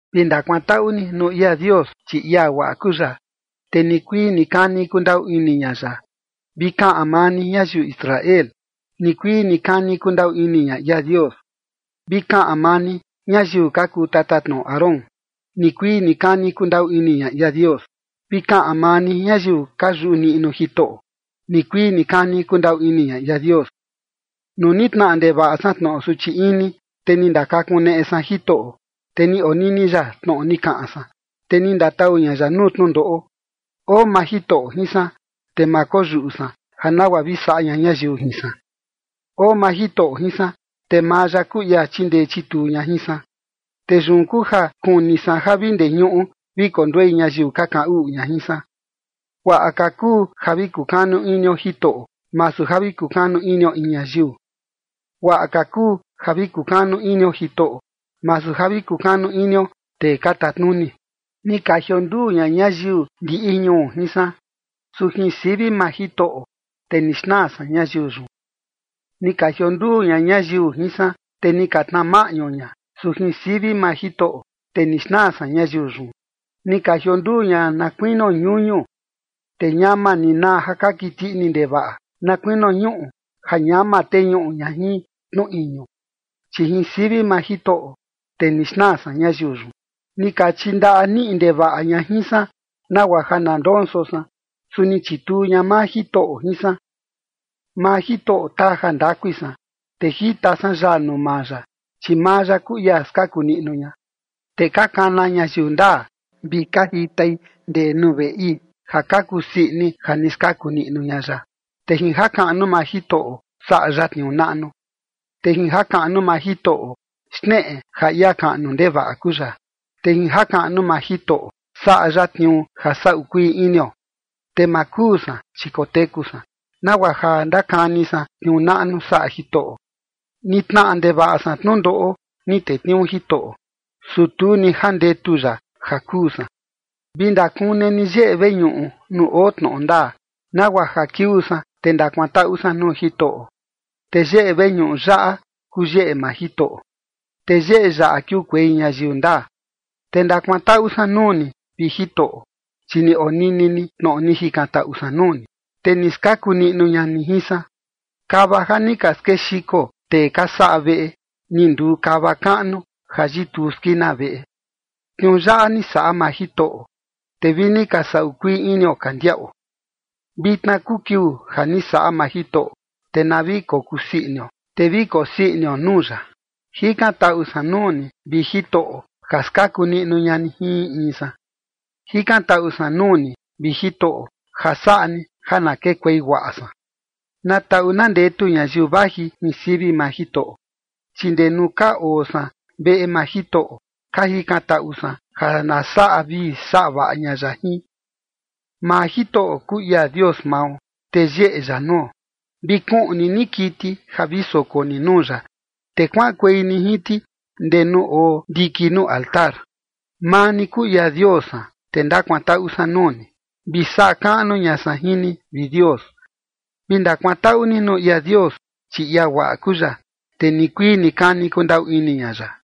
Vi ndakuantaꞌu ni nuu ia Dios, chi ia guaꞌa kuu ya, te nikuii nikani kundaꞌu ini ña ya. Vi kaꞌan maa ni, ñayiu Israel: “Nikuii nikani kundaꞌu ini ña ia Dios”. Vi kaꞌan maa ni, ñayiu ka kuu tatatnoꞌo Aarón: “Nikuii nikani kundaꞌu ini ña ia Dios”. Vi kaꞌan maa ni, ñayiu ka yuꞌu niꞌnu Jitoꞌo: “Nikuii nikani kundaꞌu ini ña ia Dios”. Nuu ni tnaꞌa ndevaꞌa san tnoꞌo suchi ini, te ni ndakakuneꞌe san Jitoꞌo, te ni onini ya tnoꞌo ni kaꞌan san, te ni ndatau ña ya nuu tnundoꞌo. Oo maa Jitoꞌo jin san, te ma koyuꞌu san ja nagua vi saꞌa ña ñayiu jin san. Oo maa Jitoꞌo jin san, te maa ya kuu ia chindee chituu ña jin san, te yun kuu ja kuni san ja vi ndee ñuꞌu vi konduei ñayiu ka kaꞌan uꞌu ña jin san. Guaꞌa ka kuu ja vi kukanu inio Jitoꞌo, masu ja vi kukanu inio in ñayiu. Guaꞌa ka kuu ja vi kukanu inio Jitoꞌo, masu ja vi kukanu inio tee ka tatnuni. Ni ka jionduu ña ñayiu ndiꞌi ñuu jin san, su jin sivi maa Jitoꞌo, te ni xnaa san ñayiu yun. Ni ka jionduu ña ñayiu jin san, te ni ka tnaa maꞌñu ña, su jin sivi maa Jitoꞌo, te ni xnaa san ñayiu yun. Ni ka jionduu ña na kuinio ñuñu, te ñama ni naa ja ka kiti ini ndevaꞌa na kuinio ñuꞌu, ja ñama teñuꞌu ña jin tnu iñu, chi jin sivi maa Jitoꞌo, te ni xnaa san ñayiu yun. Ni ka chindaꞌa niꞌi ndevaꞌa ña jin san, nagua ja na ndonso san, su ni chituu ña maa Jitoꞌo jin san. Maa Jitoꞌo taa jandakui san, te jita san yaa nuu maa ya, chi maa ya kuu ia skaku niꞌnu ña. Te ka kana ñayiu ndaa vi ka jitai ndee nuu veꞌi, ja ka kusii ini ja ni skaku niꞌnu ña ya, te jin jakaꞌnu maa Jitoꞌo, saꞌa ya tniuu naꞌnu. Te jin jakaꞌnu maa Jitoꞌo, xneꞌe ja ia kaꞌnu ndevaꞌa kuu ya, te jin jakaꞌnu maa Jitoꞌo, saꞌa ya tniuu ja saꞌu kuii inio. Te ma kuu san, chi koteku san, nagua ja ndakani san tniuu naꞌnu saꞌa Jitoꞌo. Ni tnaꞌa ndevaꞌa san tnundoꞌo, ni tetniuu Jitoꞌo, su tu ni jandetu ya ja kuu san. Vi ndakune ni yeꞌe veñuꞌu nuu oo tnoꞌo ndaa, nagua ja kiuu san, te ndakuantaꞌu san nuu Jitoꞌo. Te yeꞌe veñuꞌu yaꞌa kuu yeꞌe maa Jitoꞌo, te yeꞌe yaꞌa kiukuei ñayiu ndaa. Te ndakuantaꞌu san nuu ni, vi Jitoꞌo, chi ni onini ni tnoꞌo ni jikantaꞌu san nuu ni, te ni skaku niꞌnu ña ni jin san. Kava ja ni ka skexiko tee ka saꞌa veꞌe, ni nduu kava kaꞌnu ja yituu skina veꞌe. Tniuu yaꞌa ni saꞌa maa Jitoꞌo, te vi ni ka saꞌu kuii inio ka ndiaꞌo. Vitna kuu kiuu ja ni saꞌa maa Jitoꞌo, te na vi kokusii inio, te vi kosii inio nuu ya. Jikantaꞌu san nuu ni, vi Jitoꞌo, ja skaku niꞌnu ña ni jin in in san. Jikantaꞌu san nuu ni, vi Jitoꞌo, ja saꞌa ni ja na kekuei guaꞌa san. Na taꞌu na ndetu ñayiu vaji jin sivi maa Jitoꞌo, chi ndee nuu ka oo san veꞌe maa Jitoꞌo, ka jikantaꞌu san ja na saꞌa vii saꞌa vaꞌa ña ya jin. Maa Jitoꞌo kuu ia Dios mao, te yeꞌe ya nuo. Vi kuꞌni ni kiti ja vi soko ni nuu ya, te kuaꞌankuei ni jin ti ndee nuu oo ndiki nuu altar. Maa ni kuu ia Dios san, te ndakuantaꞌu san nuu ni, vi saꞌa kaꞌnu ña san jin ni, vi Dios. Vi ndakuantaꞌu ni nuu ia Dios, chi ia guaꞌa kuu ya, te nikuii nikani kundaꞌu ini ña ya.